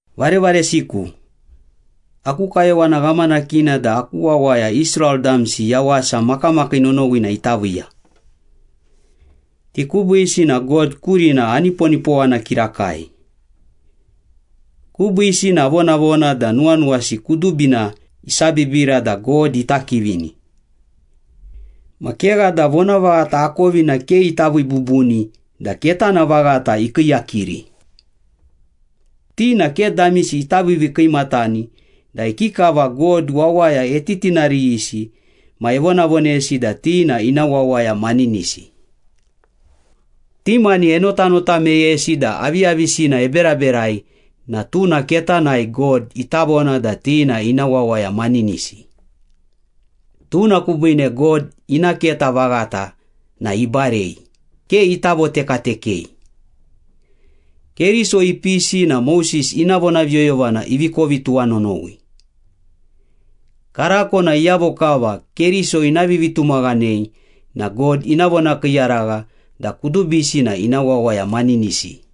Varevaresiku, aku kayowana ghamanakina da aku wawaya Israel damsi yawasa makamakii nonowina ita viiya. Ti kubiisi na God kurina aniponipowana kirakai. Kubiisi na avonavona da nuwanuwasi kudubina isabibira da God ita kivini. Ma kegha da vonavaghata akovina ke ita vii bubuni da ketana vaghata ikiiyakiri. Ti na ke damisi ita viivii kiimatani da ikikava God wawaya etitinariyisi ma evonavonesi da ti na ina wawaya maninisi. Ti mani enotanota meyesi da aviyavisina eberaberai na tuna ketanai God ita vona da ti na ina wawaya maninisi. Tuna kubiine God ina keta vaghata na ibarei, ke ita votekatekei. Keriso ipisi na Moses ina vonaviyoyovana ivi kovi tuwanonowi. Karako na iyavo kava Keriso ina vivitumaghanei na God ina vonakiiyaragha da kudubisi na ina wawaya maninisi.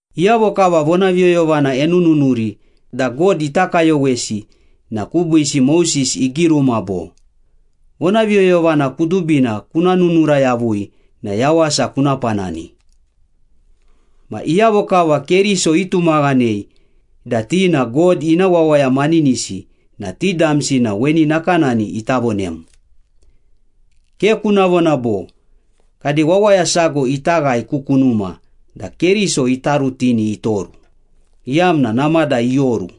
Iyavo kava vonaviyoyovana enununuri da God ita kayowesi na kubiisi Moses igiruma bo, “Vonaviyoyovana kudubina kuna nununura yavui na yawasa kuna panani.” Ma iyavo kava Keriso itumaghanei da ti na God ina wawaya maninisi na ti damsi na weni nakanani ita vonem. “Ke kuna vona bo, ‘Kade wawaya sago ita ghae ku kunuma’” da Keriso ita rutini itoru, iyamna namada ioru.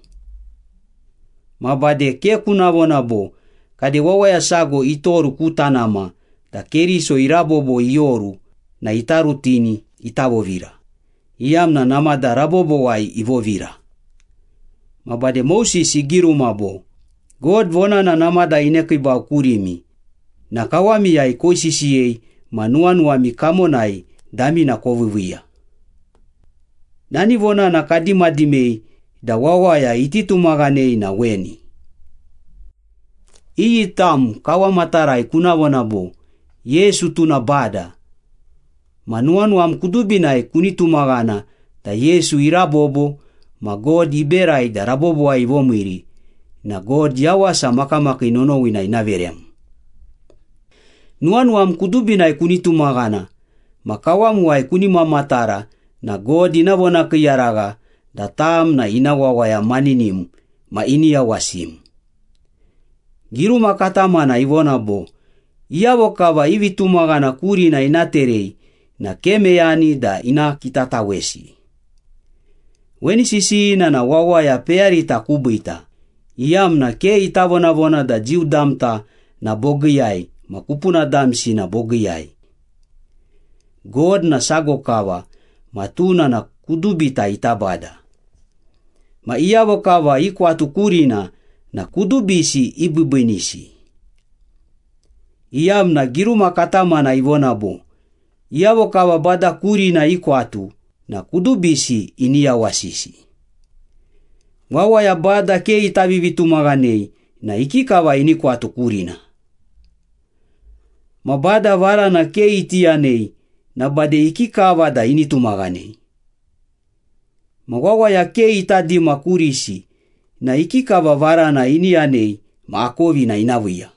Ma bade, “Ke kuna vona bo, ‘Kade wawaya sago itoru ku tanama’” da Keriso irabobo ioru na ita rutini ita vovira, iyamna namada rabobowai ivovira. Ma bade Moses igiruma bo, “God vonana namada inekiibau kurimi na kawamiyai koisisiyei ma nuwanuwami kamonai damina koviiviiya.” Nani vonana kadimadimei da wawaya iti tumaghanei na weni. Iyi tam kawamatarai kuna vona bo, “Yesu tuna Bada,” ma nuwanuwam kudubinai kuni tumaghana da Yesu irabobo ma God iberai da rabobowai ivomiiri na God yawasa makamakii nonowina ina verem. Nuwanuwam kudubinai kuni tumaghana ma kawamuwai kuni mamatara na God ina vonakiiyaragha da tam na ina wawaya maninim ma ini yawasim. Giruma katamana ivona bo, “Iyavo kava i vitumaghana kurina ina terei na ke meyani da ina kitatawesi.” Weni sisiyina na wawaya peyarita kubiita, iyamna ke ita vonavona da Jiu damta na bogiiyai ma kupuna damsi na bogiiyai. God na sago kava ma tuna na kudubita ita Bada. Ma iyavo kava ikwatu kurina na kudubisi ibiibiinisi, iyamna giruma katamana ivona bo, “Iyavo kava Bada kurina ikwatu na kudubisi ini yawasisi.” Wawaya Bada ke ita vivitumaghanei na ikikava ini kwatu kurina? Ma Bada varana ke iti yanei na bade ikikava da ini tumaghanei? Ma wawaya ke ita dima kurisi na ikikava varana ini yanei ma akovina ina viiya?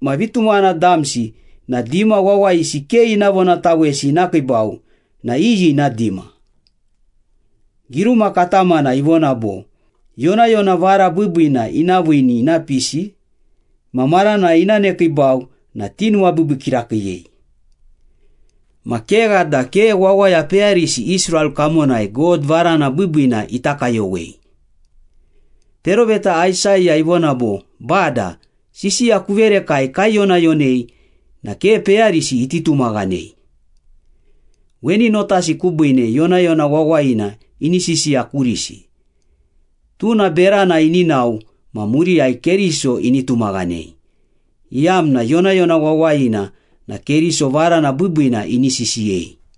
Ma vitumaghana damsi na dima wawayisi ke ina vonatawesi ina kiibau na iyi ina dima? Giruma katamana ivona bo, “Yonayona vara biibiina ina viini ina pisi ma maranai ina nekiibau na tinuwabiibii kirakiiyei.” Ma kegha da ke wawaya peyarisi Israel kamonai God varana biibiina ita kayowei. Peroveta Aisaya ivona bo, “Bada, sisiya kuverekai kaiyonayonei na ke peyarisi iti tumaghanei.” Weni notasi kubiine yonayona wawayina ini sisiya kurisi, tuna berana ini nao ma muriyai Keriso ini tumaghanei, iyamna yonayona wawayina na Keriso varana biibiina ini sisiyei.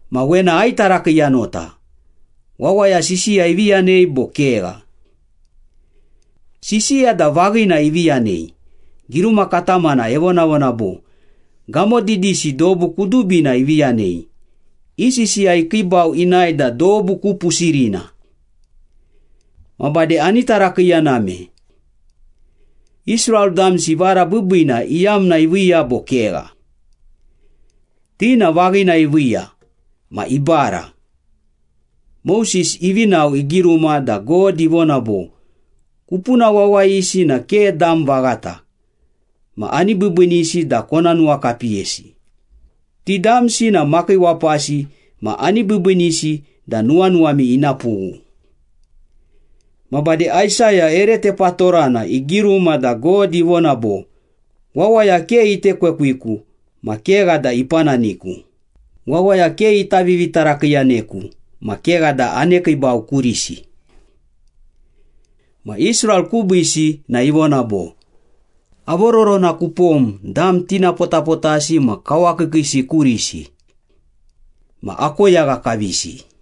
Ma wena aitarakiiyanota, wawaya sisiya ivi yanei bo kegha? Sisiya da vaghina ivi yanei. Giruma katamana evonavona bo, “Gamo didisi dobu kudubina ivi yanei, i sisiya ikiibau inae da dobu ku pusirina.” Ma bade ani tarakiiyaname. Israel damsi vara biibiina iyamna iviiya bo kegha? Ti na vaghina iviiya, ma ibara. Moses ivi nao, igiruma da God ivona bo, “Kupuna wawayisi na ke dam vaghata ma ani biibiinisi da kona nuwakapiyesi, Ti damsi na makiiwapasi ma ani biibiinisi da nuwanuwami ina pughu.” Ma bade Aisaya ere tepatorana igiruma da God ivona bo, “Wawaya ke itekwekwiku ma kegha da ipananiku, wawaya ke ita vivitarakiiyaneku ma kegha da anekiibau kurisi.” Ma Israel kubiisi na ivona bo, “Avororona kupom dam tinapotapotasi ma kawakiikiisi kurisi. Ma akoyagha kavisi.”